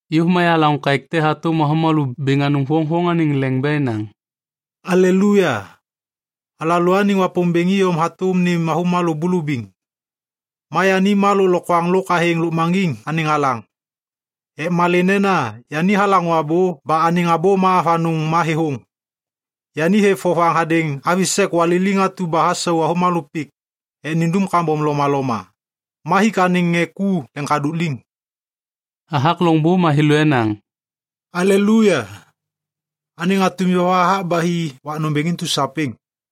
Yôv ma yahalaŋô kaêk te hatôm avômalô bêŋ anôŋ voŋvoŋ anêŋ leŋ ba enaŋ, “Aleluya! Alalôaniŋ Wapômbêŋ iyom hatôm nêm avômalô bulubiŋ, ma yani ma lôklokwaŋ lôk athêŋ lôkmaŋgiŋ anêŋ alaŋ. Ek malê nena yani halaŋô abô ba anêŋ abô ma avanôŋ ma thêthôŋ. Yani hêv vovaŋ hadêŋ avi sek waliliŋ atu ba hasau avômalô pik ek nindum kambom lomaloma, ma hik anêŋ ŋê ku leŋkadôk liŋ.” Hathak loŋbô ma thêlô enaŋ, “Aleluya! Anêŋ atum yova hathak ba hi wak nômbêŋ intu sapêŋ.”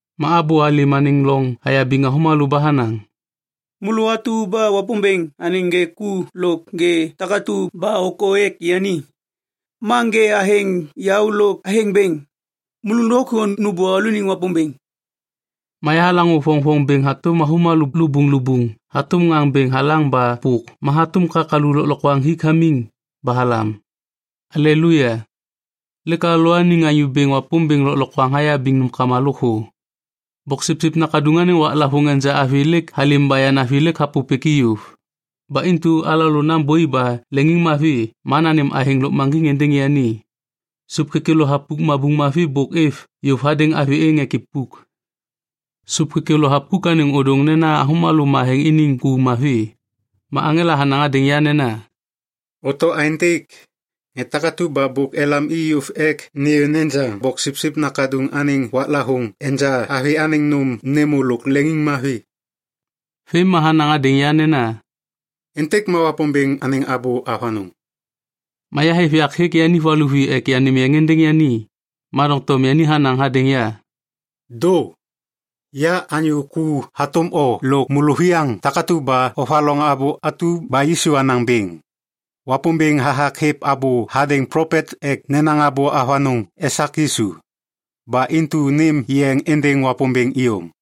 Ma abô halêm anêŋ loŋ hayabiŋ avômalô ba hanaŋ, “Môlô atu ba Wapômbêŋ anêŋ ŋê ku lôk ŋê takatu ba ôkô ek yani, ma ŋê athêŋ yaô lôk athêŋ bêŋ, môlô lôkthô nômbô alalôaniŋ Wapômbêŋ.” Ma yahalaŋô voŋvoŋ bêŋ hatôm avômalô lubuŋlubuŋ hatôm ŋaŋ bêŋ halaŋ ba pôk ma hatôm kakalu lôklokwaŋ hik hamiŋ ba halam, “Aleluya, lêk alalôaniŋ Anyô Bêŋ Wapômbêŋ Lôklokwaŋ hayabiŋ nômkama lôkthô! Boksipsip Nakaduŋ anêŋ waklavôŋ enja avi lêk halêm ba yanavi lêk hapôpêk i yôv. Ba intu alalô nambôi ba leŋiŋmavi ma nanêm athêŋ lôkmaŋgiŋ êndêŋ yani. Sôp kêkêlô thapuk mabuŋ mavi bôk êv yôv hadêŋ avi êŋ ek ipuk.” Sôp kêkêlô thapuk anêŋ ôdôŋ nena avômalô matheŋ iniŋ ku mavi. Ma aŋela hanaŋ hadêŋ ya nena, “Oto aêntêk: Ŋê takatu ba bôk elam i yôv ek nêyô nejaŋ Boksipsip Nakaduŋ anêŋ waklavôŋ enja avi anêŋ nôm nêmô lôk leŋiŋmavi.” Vêm ma hanaŋ hadêŋ ya nena, “Êntêk ma Wapômbêŋ anêŋ abô avanôŋ.” Ma yahêv yak hêk yani valuvi ek yanêm yeŋ êndêŋ yani. Ma doŋtom yani hanaŋ hadêŋ ya, “Dô! Ya anyô ku hatôm o lôk môlôviyaŋ takatu ba ovaloŋ abô atu ba Yisu hanaŋ bêŋ. Wapômbêŋ hathak hêv abô hadêŋ plopet ek nenaŋ abô avanôŋ esak Yisu. Ba intu nêm yeŋ êndêŋ Wapômbêŋ iyom.”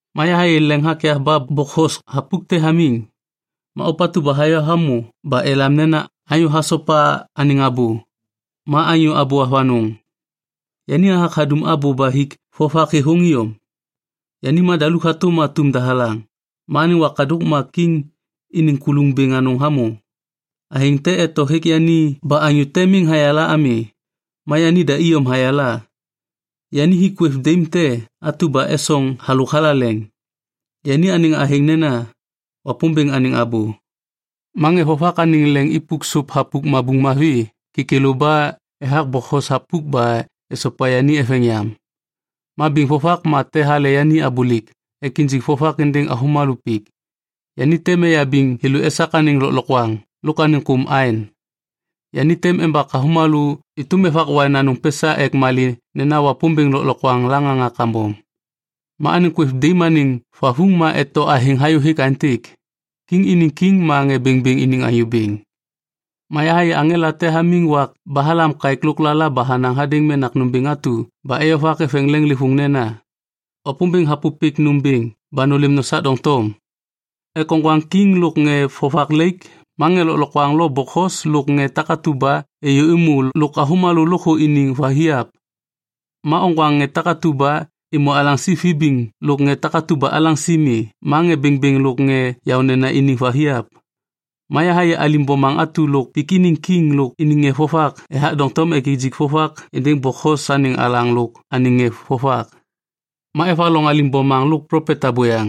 Ma yahayê leŋ hakyav ba bokhos thapuk te hamiŋ. Ma ôpatu ba hayô hamô ba elam nena “Anyô Hasopa Anêŋ Abô” ma “Anyô Abô Avanôŋ”. Yani hathak hadum abô ba hik vovak thêthôŋ iyom. Yani madaluk hatôm atum dahalaŋ, ma anêŋ wakadôk ma kiŋ iniŋ kuluŋ bêŋ anôŋ hamô. Athêŋ te eto hêk yani ba anyô te miŋ hayala ami, ma yanida iyom hayala. Yani hik kwêv daim te atu ba esoŋ halôk thalaleŋ. Yani anêŋ athêŋ nena, “Wapômbêŋ Anêŋ Abô”. Ma ŋê vovak anêŋ leŋ ipuk sôp thapuk mabuŋ mavi kêkêlô ba ethak bokhos thapuk ba esopa yani eveŋ yam. Ma biŋ vovak ma te hale yani abôlêk ek injik vovak êndêŋ avômalô pik. Yani tem eyabiŋ thêlô esak anêŋ lôklokwaŋ lôk anêŋ kôm aeŋ. Yani tem embak avômalô êtôm evak waiŋ anôŋ pesa ek malê nena Wapômbêŋ Lôklokwaŋ laŋaŋa kambom. Ma anêŋ kwêv daim anêŋ vavuŋ ma eto athêŋ hayôhêk aêntêk, “Kiŋ iniŋ Kiŋ ma ŋê bêŋbêŋ iniŋ Anyô Bêŋ.” Ma yahayê aŋela te hamiŋ wak ba halam kaêk lôklala ba hanaŋ hadêŋ menak nômbêŋ atu ba eyovak eveŋ leŋlêvôŋ nena, “Wapômbêŋ hapôpêk nômbêŋ ba nôlêm nosak doŋtom ek oŋgwaŋ kiŋ lôk ŋê vovak laik ma ŋê lôklokwaŋ lo bokhos lôk ŋê takatu ba êyômô lôk avômalô lôkthô iniŋ vathiap. Ma oŋgwaŋ ŋê takatu ba êmô alaŋsi vibiŋ lôk ŋê takatu ba alaŋsi mi ma ŋê bêŋbêŋ lôk ŋê yaônena iniŋ vathiap.” Ma yahayê alim bomaŋ atu lôk pik iniŋ kiŋ lôk iniŋ ŋê vovak ethak doŋtom ek nijik vovak êndêŋ bokhos anêŋ alaŋ lôk anêŋ ŋê vovak. Ma evaloŋ alim bomaŋ lôk plopet abôyaŋ.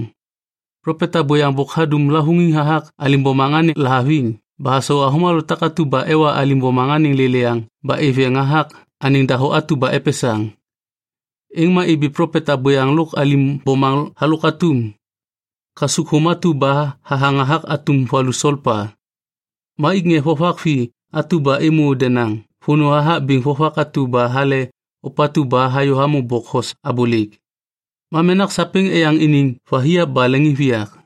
Plopet abôyaŋ bôk hadum lavôŋiŋ hathak alim bomaŋ anêŋ lahaviŋ ba hasau avômalô takatu ba ewa alim bomaŋ anêŋ lêlêyaŋ ba êv yeŋ hathak anêŋ dahô atu ba epesaŋ. Êŋ ma ibi plopet abôyaŋ lôk alim bomaŋ halôk atum kasukthôm atu ba hathaŋ hathak atum valu solpa. Ma ik ŋê vovak vi atu ba êmô denaŋ vônô hathak biŋ vovak atu ba hale ôpatu ba hayô hamô bokhos abôlêk. Ma menak sapêŋ eyaŋ iniŋ vathiap ba leŋiŋviyak.